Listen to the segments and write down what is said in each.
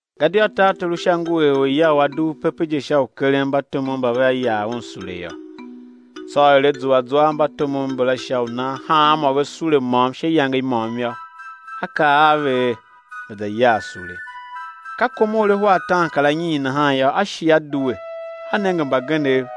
Gadia tartor u Sha ngu er orya u a dugh pepe je sha u keren mbatomov mba vea yar un sule yô. Tsô er a zua zwa a mbatomov mbala sha u nan hanmô ve sule môm sha iyange i môm yô, a kaa a ve er, ve̱ za yar sule. Ka kom er ahwa ataankaranyiin nahan yô, a shi a due, a nenge mbagenev,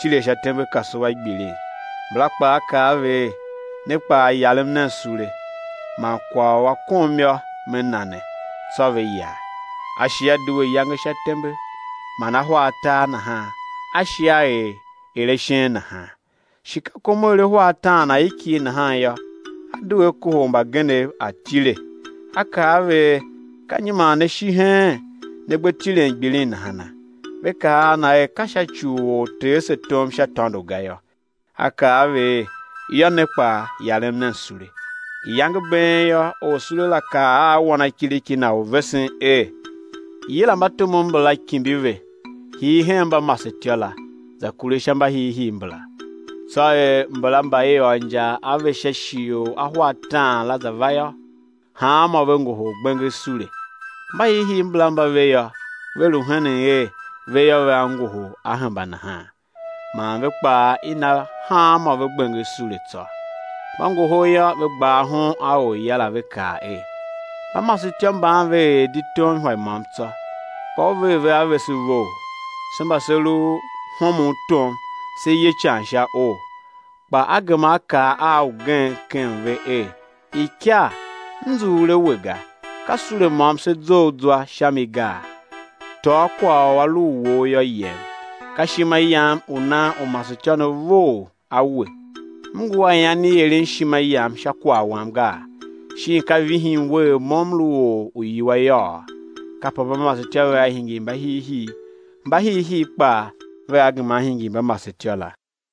tile sha tembekasua gbilin. Mbala kpaa A kaa a ve er: Ne kpaa yarem nen sule, man kwagh u a kom yô, me na ne. Tsô ve yar. A shi a due iyange sha tembe, man ahwa atar nahan, a shi a er er ashen nahan. Shi ka kom er ahwa ataan aikighe nahan yô, a due a kohol mbagenev atile, a kaa a ve er: Ka nyi man ne shi heen ne gbe tilen gbilin nahana? Ve kaa a na er: Ka sha ci u or tee se tom sha tôndo ga yô. A kaa a ve er: Yô, ne kpaa yarem nen sule. Iyange i been yô, orsule la kaa a wanakiriki na u vesen er: Yila mbatomov mbala, kimbi ve, hii hen mbamasetyô la, za kure sha mbahiihii mbala. Tsô er mbala mba i ôr injar a ve sha shighe u ahwa ataan la za va yô, hanmô ve ngohol gbenger sule. Mbahiihii mbala mba ve yô, ve lu henen er, ve yô, vea ngohol á hemba nahan. Man ve kpaa i na hanmô ve gbenger sule tsô. Mba ngohol yô, ve gba ahon a orya la, ve kaa er: Mbamasetyô mban ve er di tom ihwa i môm tsô, kpa u ver ve a vese vough, se mba se lu homon tom, se ye ican sha oo. Kpa a gema a kaa a ugen ken ve er: Ikar, m nzughul a we ga, ka sule môm se zough zwa sha mi gaa? Tôô kwagh u a lu u wou yô, yem! Ka ishima yam u nan u masetyô ne vough a we. M ngu a ian i eren ishima yam sha kwagh wam gaa? Shin ka vihin we er mo m lu or u iwua yôô? Kape mbamasetyô vea hingir mbahiihii; mbahiihii kpaa vea gema á hingir mbamasetyô la.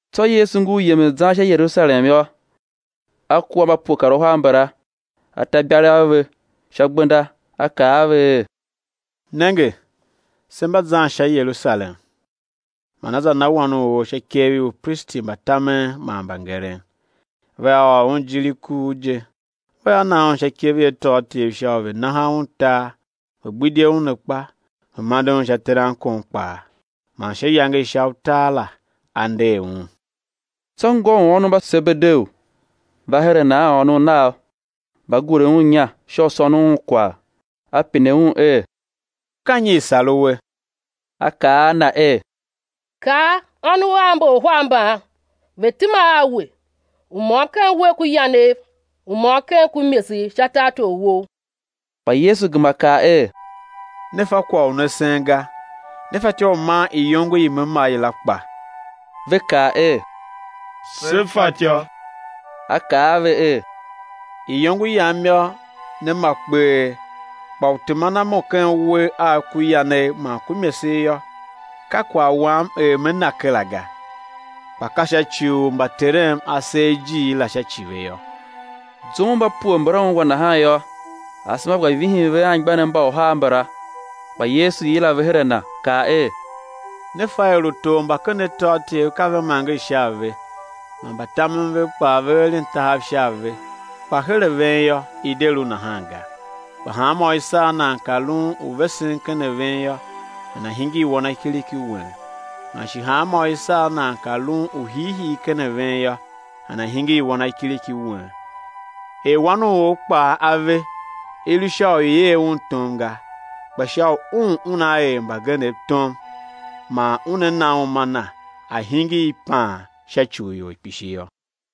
Tsô Yesu ngur yemen zan sha Yerusalem yô, A kua a mba pue kar uhar mbala, a ta ibalegh a ve sha gbenda, A kaa a ve er: Nenge, se mba zan sha Yerusalem; man á za na Wan u or sha ikev i upristi mba tamen man mbangeren; vea ôr Un ijir i kuugh je, vea na Un sha ikev i atôatyev sha u ve̱ naha Un tar ve̱ gbidye Un akpa, ve̱ mande Un sha terankon kpaa, man sha iyange i sha utar la á nder Un. Tsô ngô u ônov mba Sebedeu va her a Na a ônov nav, va gure Un inya sha u sônon Un kwagh. A pine un er: Ka nyi i̱ sar uwe? A kaa a Na er: Kaa, ônov av mba uhar mban ve tema a We, u môm ken uwegh ku yanegh, u môm ken ku imesegh sha tartor Wou. Kpa Yesu gema kaa er: Ne fa kwagh u ne sen ga. Ne fatyô u man iyongo i Me ma i la kpa? Ve kaa er: Se fatyô. A kaa a ve er: Iyongo Yam yô, né ma kpee; kpa u teman a Mo ken uwegh Agh ku yanegh man ku imesegh yô, ka kwagh Wam er Me na kera ga, kpa ka sha ci u mba Terem A ser ijiir la sha ci ve yô. Zum u mba pue mbala ungwa nahan yô, asema gba vihin ve a anmgbianev mba uhar mbala. Kpa Yesu yila ve her a Na, kaa er: Ne fa er utor mba ken atôatyev ka ve manger sha a ve, man mbatamen vev kpaa ve eren tahav sha a ve; kpa her a ven yô, i̱ de lu nahan ga; kpa hanmô u i sar nan ka lun u vesen ken a ven yô, nana̱ hingir wanakiriki wen. Man shi hanmô u i sar nan ka lun u hiihii ken a ven yô, nana̱ hingir wanakiriki wen, er Wan u or kpaa A ve, i lu sha u i̱ er Un tom ga, kpa sha u Un Una er mbagenev tom man Una na uma Na á hingir ipaan sha ci u ior kpishi yô.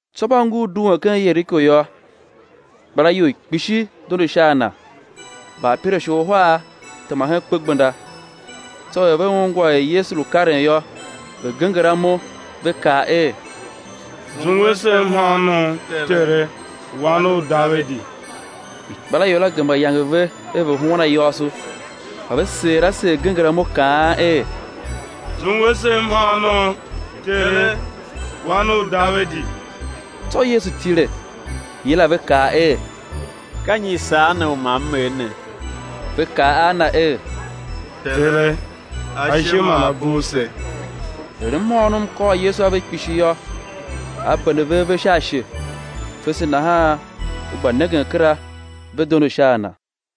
Tsô mba ngur duen ken Yeriko yô, ikpelaior i kpishi dondo sha a na. Mbaapirashe uhar tema hen kpegbenda. Tsô er ve ungwa er Yesu lu karen yô, ve genger amo, ve kaa er: Zungwe se mhôônom, Tere, Wan u Davidi! Ikpelaior la gema yange ve er ve̱ huan ayôôso; kpa ve seer a seer genger amo kaan er: Zungwe se mhôônom, Tere, Wan u Davidi! Tsô Yesu tile, yila ve kaa er: Ka nyi i sar ne u ma M er ne? Ve kaa a Na er: Tere, ashe ma a bugh se. Er mhôônom kôr Yesu a ve kpishi yô, A bende ve ave sha ashe; fese nahan ve gba nengen kera, ve dondo sha a Na.